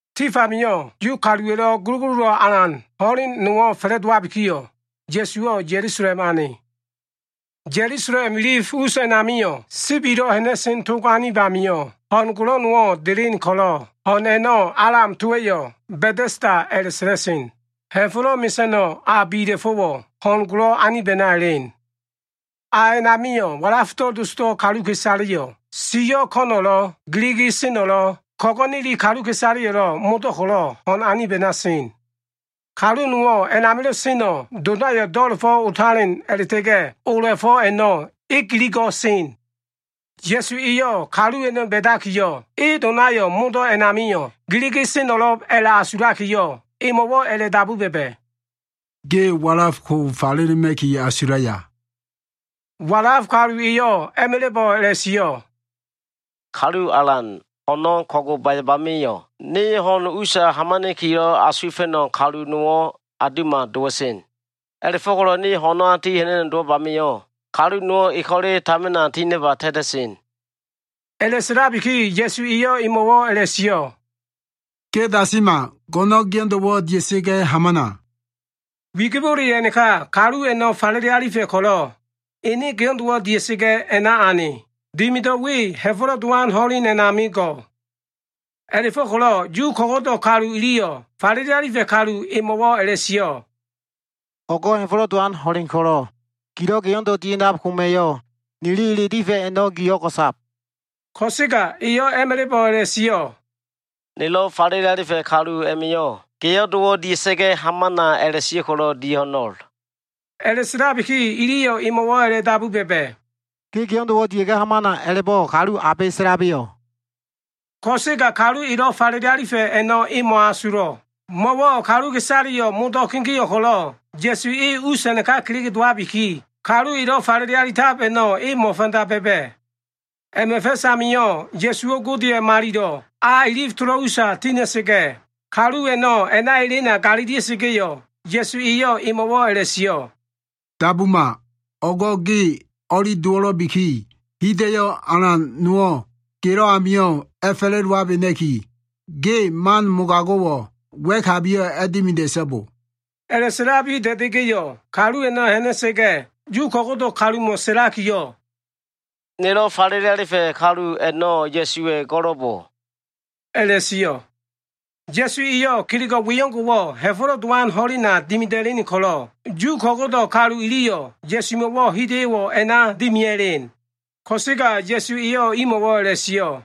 Tif amio꞉ Yu kaluwa꞉lo꞉ gulugululan alan ho꞉len nowo꞉ fa꞉la꞉dowabikiyo꞉, Ya꞉suwo꞉ Ya꞉lusalem ane. Ya꞉lusalem ilif us a꞉namio꞉ Sibilo꞉ Ha꞉na꞉sen Tog anib amio꞉ ho꞉n golo꞉ nowo꞉ delen ko꞉lo꞉, ho꞉n a꞉no꞉ Alam towa꞉yo꞉ Ba꞉ta꞉sda a꞉la꞉sa꞉la꞉sen. Ha꞉fo꞉lo꞉ mesa꞉no꞉ a bila꞉fo꞉wo꞉ ho꞉n golo꞉ anib a꞉na elen. A a꞉namio꞉ walafdo꞉ dosdo꞉ kaluka꞉isaleyo꞉, siyo꞉ ko꞉no꞉lo꞉, giligi seno꞉lo꞉, ko꞉go꞉neli kaluka꞉isaleyo꞉lo꞉ modo꞉ ko꞉lo꞉ ho꞉n anib a꞉na sen. Kalu nowo꞉ a꞉namilo꞉ seno꞉, donayo꞉ do꞉la꞉fo꞉ otalen a꞉la꞉ta꞉ga꞉ ola꞉fo꞉ a꞉no꞉ e giligo꞉ sen. Ya꞉su eyo꞉ kalu a꞉no꞉ ba꞉dakiyo꞉, e donayo꞉ modo꞉ a꞉namio꞉ giligi seno꞉lo꞉b a꞉la꞉asulakiyo꞉, emo꞉wo꞉ a꞉la꞉dabu ba꞉ba꞉, “Ge walaf ko falelema꞉ki asulaya?” Walaf kalu eyo꞉ a꞉ma꞉la꞉bo꞉ a꞉la꞉sio꞉, “Kalu alan, ho꞉no꞉ ko꞉gobayab amio꞉, ne ho꞉n usa hamana꞉kilo꞉ asuwa꞉fa꞉no꞉ kalu nowo꞉ aundo꞉ma dowa꞉sen. A꞉la꞉fo꞉ko꞉lo꞉ ne ho꞉na ti ha꞉na꞉no꞉ dowab amio꞉, kalu nowo꞉ e ko꞉le tamina tinaba ta꞉ta꞉sen.” A꞉la꞉sa꞉labiki Ya꞉su eyo꞉ emo꞉wo꞉ a꞉la꞉sio꞉, “Ge dasima! Go꞉no꞉n geo꞉ndo꞉wo꞉ dia꞉sa꞉ga꞉ hamana.” Wigibole a꞉naka kalu a꞉no꞉ falele alifa꞉ ko꞉lo꞉, ene geo꞉ndo꞉wo꞉ dia꞉sa꞉ga꞉ a꞉na ane. Dimido꞉ we Ha꞉fo꞉lo꞉ Dowan ho꞉len a꞉nami go꞉. A꞉la꞉fo꞉ko꞉lo꞉ Yu ko꞉go꞉do꞉ kalu iliyo꞉ falele alifa꞉ kalu emo꞉wo꞉ a꞉la꞉sio꞉, “O꞉go꞉ Ha꞉fo꞉lo꞉ Dowan ho꞉len ko꞉lo꞉ gilo꞉ geo꞉ndo꞉ dia꞉ha꞉nab koma꞉yo꞉, nili ele difa꞉ a꞉no꞉ gi o꞉go꞉sab.” Ko꞉sega eyo꞉ a꞉ma꞉la꞉bo꞉ a꞉la꞉sio꞉, “Nelo꞉ falele alifa꞉ kalu a꞉ma꞉yo꞉ ‘Geo꞉ndo꞉wo꞉ dia꞉sa꞉ga꞉ hamana’ a꞉la꞉sio꞉ ko꞉lo꞉ dia꞉ho꞉no꞉l.” A꞉la꞉sa꞉labiki iliyo꞉ emo꞉wo꞉ a꞉la꞉dabu ba꞉ba꞉, “ ‘Ge geo꞉ndo꞉wo꞉ dia꞉ga꞉ hamana’ a꞉la꞉bo꞉ kalu abe sa꞉labeyo꞉?” Ko꞉sega kalu elo꞉ falele alifa꞉ a꞉no꞉ e mo꞉asulo꞉. Mo꞉wo꞉ kaluka꞉isaleyo꞉ modo꞉ kegeo꞉ ko꞉lo꞉, Ya꞉su e us a꞉naka kelege dowabiki, kalu elo꞉ falele alitab a꞉no꞉ e mo꞉fanda ba꞉ba꞉. A꞉ma꞉ fa꞉s amio꞉ Ya꞉suwo꞉ Godeya꞉ Malilo꞉ A ilif tolo꞉ usa tina꞉sa꞉ga꞉, kalu a꞉no꞉ a꞉na elena galilia꞉sa꞉ga꞉yo꞉, Ya꞉su eyo꞉ emo꞉wo꞉ a꞉la꞉sio꞉, “Dabuma! O꞉go꞉ ge o꞉li dowo꞉lo꞉biki, hida꞉yo꞉ alan nowo꞉ gelo꞉ amio꞉ a꞉fa꞉la꞉dowabena꞉ki, ge man mogago꞉wo꞉ wa꞉kabiyo꞉ dimida꞉so꞉bo!” A꞉la꞉sa꞉labi da꞉da꞉ga꞉yo꞉, kalu a꞉no꞉ ha꞉na꞉sa꞉ga꞉, Yu ko꞉go꞉do꞉ kalumo꞉ sa꞉lakiyo꞉, “Nelo꞉ falele alifa꞉ a꞉no꞉ Ya꞉suwa꞉ go꞉lo꞉bo” a꞉la꞉sio꞉. Ya꞉su eyo꞉ kelego꞉ we o꞉ngo꞉wo꞉ Ha꞉fo꞉lo꞉ Dowan ho꞉lena dimida꞉len ko꞉lo꞉, Yu ko꞉go꞉do꞉ kalu iliyo꞉ Ya꞉sumo꞉wo꞉ hida꞉yo꞉wo꞉ a꞉na dimia꞉len. Ko꞉sega Ya꞉su eyo꞉ imo꞉wo꞉ a꞉la꞉sio꞉,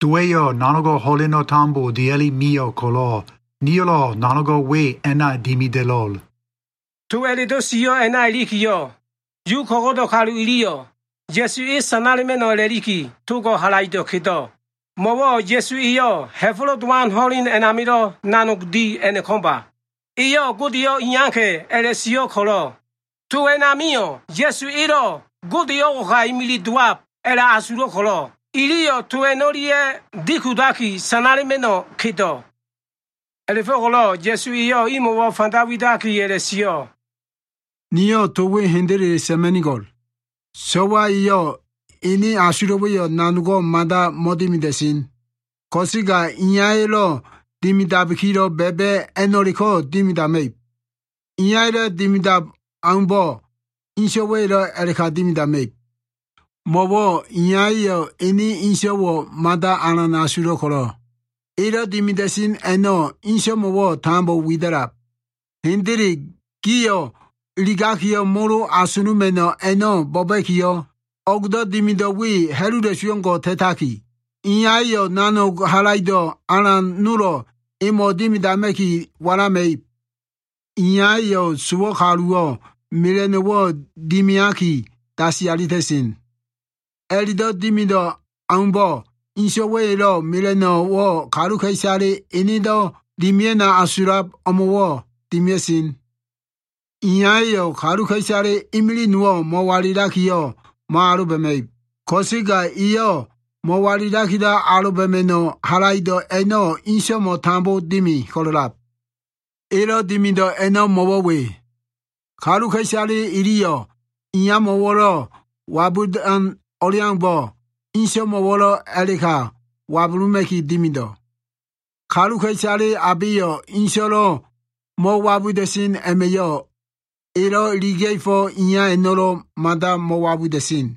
“Dowa꞉yo꞉ nanogo꞉ ho꞉leno꞉ tambo dia꞉li mio꞉ ko꞉lo꞉, niyo꞉lo꞉ nanogo꞉ we a꞉na dimida꞉lo꞉l.” To a꞉la꞉do꞉ sio꞉ a꞉na ilikiyo꞉, Yu ko꞉go꞉do꞉ kalu iliyo꞉ Ya꞉su e sanala꞉ma꞉no꞉ a꞉la꞉liki togo꞉ halaido꞉ kedo꞉. Mo꞉wo꞉ Ya꞉su eyo꞉ Ha꞉fo꞉lo꞉ Dowan ho꞉len amilo꞉ nanog di a꞉no꞉ ko꞉mba. Eyo꞉ Godeyo꞉ iyaka꞉ a꞉la꞉sio꞉ ko꞉lo꞉, to a꞉namio꞉ Ya꞉su elo꞉ Gode o꞉ngo꞉ka imili dowab a꞉la꞉asulo꞉ ko꞉lo꞉, iliyo꞉ to a꞉no꞉lia꞉ dikudaki, sanala꞉ma꞉no꞉ kedo꞉. A꞉la꞉fo꞉ko꞉lo꞉ Ya꞉su eyo꞉ imo꞉wo꞉ fanda widaki a꞉la꞉sio꞉, “Niyo꞉ to we hendele sa꞉ma꞉nigo꞉l. So꞉wa eyo꞉ ene asulo꞉wa꞉yo꞉ nanogo꞉ mada mo꞉dimida꞉sen. Ko꞉sega Iyaya꞉lo꞉ dimidabikilo꞉ ba꞉ba꞉ a꞉no꞉leko꞉ dimidama꞉ib. Iyaya꞉lo꞉ dimidab aumbo꞉, Inso꞉wa꞉yo꞉lo꞉ a꞉la꞉ka dimidama꞉ib. Mo꞉wo꞉ iyaya꞉yo꞉ ene Inso꞉wo꞉ mada alan asulo꞉ ko꞉lo꞉, elo꞉ dimida꞉sen a꞉no꞉ inso꞉mo꞉wo꞉ tambo wida꞉lab. Hendele, gio꞉ iligaki molo asuluma꞉no꞉ a꞉no꞉ bo꞉ba꞉kiyo꞉, o꞉gdo꞉ dimido꞉ we ha꞉lula꞉su o꞉ngo꞉ ta꞉taki, Iyaya꞉yo꞉ nanog halaido꞉ alan nolo꞉ emo꞉ dimidama꞉ki walama꞉ib. Iyaya꞉yo꞉ sowo꞉ kaluwo꞉ mela꞉no꞉wo꞉ dimiaki dasi alita꞉sen. A꞉la꞉do꞉ dimido꞉ aumbo꞉, Inso꞉wa꞉yo꞉lo꞉ mela꞉no꞉wo꞉ kaluka꞉isale enedo꞉ dimia꞉no꞉ asulab o꞉mo꞉ dimia꞉sen. Iyaya꞉yo꞉ kaluka꞉isale imilig nowo꞉ mo꞉walilakiyo꞉ mo꞉aloba꞉ma꞉ib. Ko꞉sega eyo꞉ mo꞉walilakilo꞉ aloba꞉ma꞉no꞉ halaido꞉ a꞉no꞉ Inso꞉mo꞉ tambo dimi ko꞉lo꞉lab. Elo꞉ dimido꞉ a꞉no꞉ mo꞉wo꞉ we. Kaluka꞉isale iliyo꞉ Iyamo꞉lo꞉ wabudan o꞉leaumbo꞉, Inso꞉mo꞉wo꞉lo꞉ a꞉la꞉ka wabuluma꞉ki dimido꞉. Kaluka꞉isale abeyo꞉ Inso꞉lo꞉ mo꞉wabuda꞉sen a꞉ma꞉yo꞉, elo꞉ iliga꞉fo꞉ Iya a꞉no꞉lo꞉ mada mo꞉wabuda꞉sen.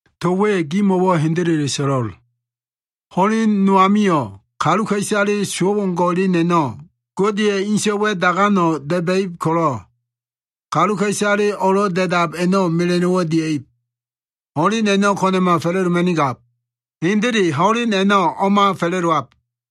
“To we gimo꞉wo꞉ hendele so꞉lo꞉l. Ho꞉len no amio꞉ kaluka꞉isale sowo꞉ o꞉ngo꞉ elen a꞉no꞉ Godeya꞉ ene So꞉waya꞉ dagano꞉ da꞉ba꞉ib ko꞉lo꞉, kaluka꞉isale o꞉lo꞉ da꞉dab a꞉no꞉ mela꞉no꞉wo꞉ dia꞉ib. Ho꞉len a꞉no꞉ ko꞉na꞉ma fa꞉la꞉doma꞉nigab. Hendele ho꞉len a꞉no꞉ o꞉ma fa꞉la꞉dowab.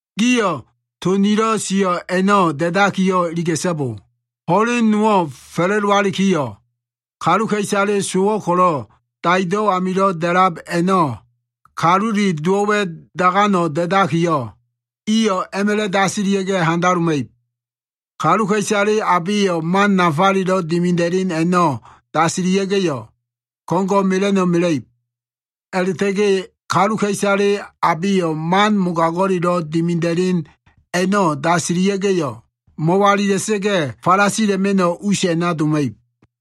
Gio꞉ to nilo꞉ sio꞉ a꞉no꞉ da꞉dakiyo꞉ iliga꞉so꞉bo! Ho꞉len nowo꞉ fa꞉la꞉dowalikiyo꞉, kaluka꞉isale sowo꞉ ko꞉lo꞉ daido꞉ amilo꞉ da꞉lab a꞉no꞉ Kalule Dowo꞉wa꞉ dagano꞉ da꞉dalikiyo꞉, iyo꞉ a꞉ma꞉la꞉ dasilia꞉ga꞉ handaloma꞉ib. Kaluka꞉isale abeyo꞉ man nafalelo꞉ dimida꞉len a꞉no꞉ dasilia꞉ga꞉yo꞉, ko꞉ngo꞉ mela꞉no꞉ mela꞉ib. A꞉la꞉ta꞉ga꞉ kaluka꞉isale abeyo꞉ man mogago꞉lelo꞉ dimida꞉len a꞉no꞉ dasilia꞉ga꞉yo꞉, mo꞉walila꞉sa꞉ga꞉ falasila꞉ma꞉no꞉ us a꞉na doma꞉ib.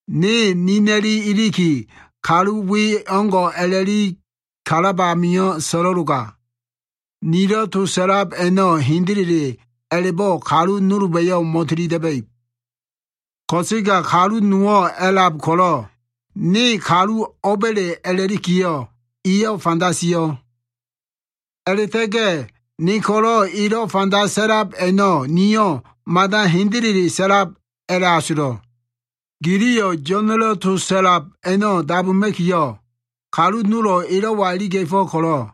Ne nina꞉li iliki, kalu we o꞉ngo꞉ a꞉la꞉li kalab ami so꞉lo꞉loga, nilo꞉ to sa꞉lab a꞉no꞉ hendele a꞉la꞉bo꞉ kalu nolba꞉yo꞉ mo꞉tilida꞉ba꞉ib. Ko꞉sega kalu nowo꞉ a꞉lab ko꞉lo꞉, ne kalu o꞉ba꞉le a꞉lakiyo꞉ eyo꞉ fanda sio꞉. A꞉la꞉ta꞉ga꞉ ne ko꞉lo꞉ elo꞉ fanda sa꞉lab a꞉no꞉ niyo꞉ mada hendele sa꞉lab a꞉la꞉asulo꞉. “Giliyo꞉ Yo꞉na꞉lo꞉ to sa꞉lab a꞉no꞉ dabuma꞉kiyo꞉, kalu nolo꞉ elo꞉wa iliga꞉fo꞉ ko꞉lo꞉,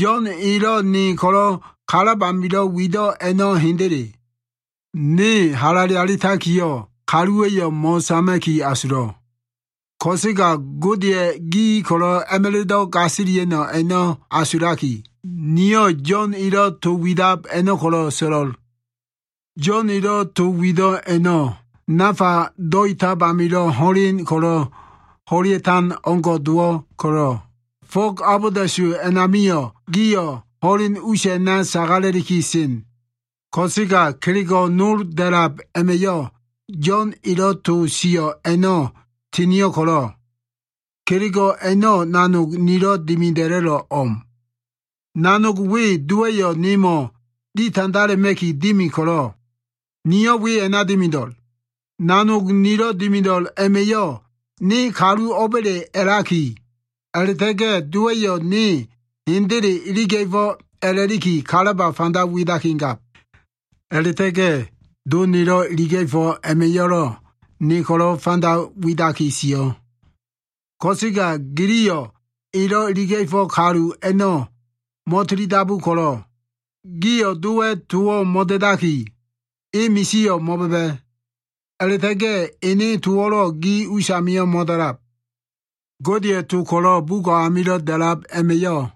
Yo꞉n elo꞉ ne ko꞉lo꞉ kalab amilo꞉ wido꞉ a꞉no꞉ hendele. Ne halale alitakiyo꞉, kaluwa꞉yo꞉ mo꞉sama꞉ki asulo꞉. Ko꞉sega Godeya꞉ gi ko꞉lo꞉ a꞉ma꞉la꞉do꞉ gasilia꞉no꞉ a꞉no꞉ asulaki, niyo꞉ Yo꞉n elo꞉ to widab a꞉no꞉ ko꞉lo꞉ so꞉lo꞉l. Yo꞉n elo꞉ to wido꞉ a꞉no꞉ nafa do꞉itab amilo꞉ ho꞉len ko꞉lo꞉ ho꞉lea꞉tan o꞉ngo꞉ dowo꞉ ko꞉lo꞉, fog abolda꞉su a꞉namio꞉ gio꞉ ho꞉len us a꞉na sagala꞉liki sen. “Ko꞉sega kelego꞉ nol da꞉lab a꞉ma꞉yo꞉ Yo꞉n elo꞉ to sio꞉ a꞉no꞉ tinio꞉ ko꞉lo꞉, kelego꞉ a꞉no꞉ nanog nilo꞉ dimida꞉lo꞉lo꞉ o꞉m. Nanog we Dowa꞉yo꞉ nemo꞉ ditandala꞉ma꞉ki dimi ko꞉lo꞉, niyo꞉ we a꞉na dimido꞉l. Nanog nilo꞉ dimido꞉l a꞉ma꞉yo꞉ ne kalu o꞉ba꞉le a꞉laki, a꞉la꞉ta꞉ga꞉ Dowa꞉yo꞉ ne hendele iliga꞉fo꞉ a꞉la꞉liki kalaba fanda widaki gab. “A꞉la꞉ta꞉ga꞉ Do nelo꞉ iliga꞉fo꞉ a꞉ma꞉yo꞉lo꞉ ne ko꞉lo꞉ fanda widaki sio꞉. Ko꞉sega giliyo꞉ elo꞉ iliga꞉fo꞉ kalu a꞉no꞉ mo꞉tilidabu ko꞉lo꞉, gio꞉ Dowa꞉ towo꞉ mo꞉da꞉daki, e misio꞉ mo꞉ba꞉ba꞉. A꞉la꞉ta꞉ga꞉ ene towo꞉lo꞉ gi usamio꞉ mo꞉da꞉lab. “Godeya꞉ to ko꞉lo꞉ bugo꞉ amilo꞉ da꞉lab a꞉ma꞉yo꞉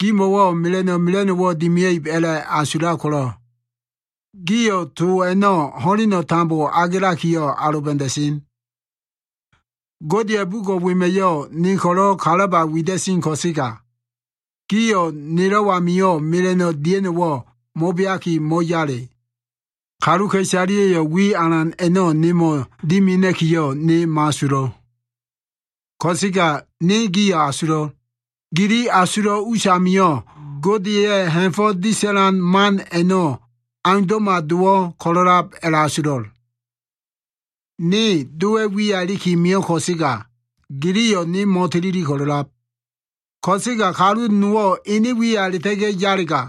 gimo꞉wo꞉ mela꞉no꞉ mela꞉no꞉wo꞉ dimia꞉ib a꞉la꞉asulab ko꞉lo꞉, gio꞉ to a꞉no꞉ ho꞉leno꞉ tambo agelakiyo꞉ aloba꞉da꞉sen. Godeya꞉ bugo꞉ wema꞉yo꞉ ne ko꞉lo꞉ kalaba wida꞉sen ko꞉sega, gio꞉ nelo꞉ amio꞉ mela꞉no꞉ dia꞉no꞉wo꞉ mo꞉beaki mo꞉yale. “Kaluka꞉isaleya꞉yo꞉ wi alan a꞉no꞉ nemo꞉ dimina꞉kiyo꞉ ne mo꞉asulo꞉. Ko꞉sega ne gio꞉ asulo꞉l. Gili asulo꞉ us amio꞉, Godeya꞉ ha꞉fo꞉ disa꞉ma꞉no꞉ man a꞉no꞉ aundo꞉ma dowo꞉ ko꞉lo꞉lab a꞉la꞉asulo꞉l. Ne Dowa꞉ wiya iliki mio꞉ ko꞉sega, giliyo꞉ ne mo꞉tilili ko꞉lo꞉lab. Ko꞉sega kalu nowo꞉ ene wiya a꞉la꞉ta꞉ga꞉ yalega,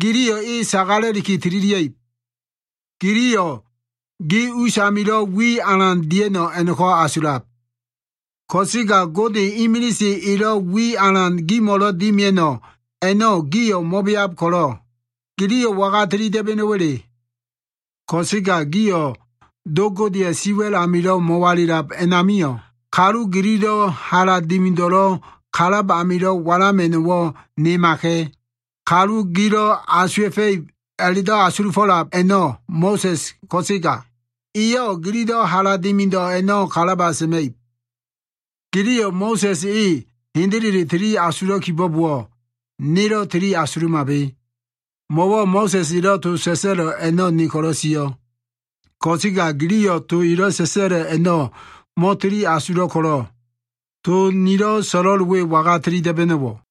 giliyo꞉ e sagala꞉liki tililia꞉ib. Giliyo꞉ gi usamilo꞉ wi alan dia꞉no꞉ a꞉no꞉ko꞉ asulab. Ko꞉sega Gode imilise elo꞉ wi alan gimo꞉lo꞉ dimia꞉no꞉ a꞉no꞉ gio꞉ mo꞉beab ko꞉lo꞉, giliyo꞉ waga tili da꞉ba꞉no꞉wa꞉le? “Ko꞉sega gio꞉ Do Godeya꞉ siwa꞉l amilo꞉ mo꞉walilab a꞉namio꞉, kalu gililo꞉ hala dimido꞉lo꞉ kalab amilo꞉ walama꞉no꞉wo꞉ nimaka꞉. Kalu gilo꞉ asuwa꞉fa꞉ib a꞉la꞉do꞉ asulufo꞉lab a꞉no꞉ Mo꞉sa꞉s ko꞉sega, eyo꞉ gililo꞉ hala dimido꞉ a꞉no꞉ kalaba sa꞉ma꞉ib. Giliyo꞉ Mo꞉sa꞉s e hendele tili asulo꞉ kibo꞉bowo꞉, nelo꞉ tili asulumabe. Mo꞉wo꞉ Mo꞉sa꞉s elo꞉ to sa꞉sa꞉lo꞉ a꞉no꞉ ne ko꞉lo꞉ sio꞉. Ko꞉sega giliyo꞉ to elo꞉ sa꞉sa꞉lo꞉ a꞉no꞉ mo꞉tili asulo꞉ ko꞉lo꞉, to nilo꞉ so꞉lo꞉l we waga tili da꞉ba꞉no꞉wo꞉?”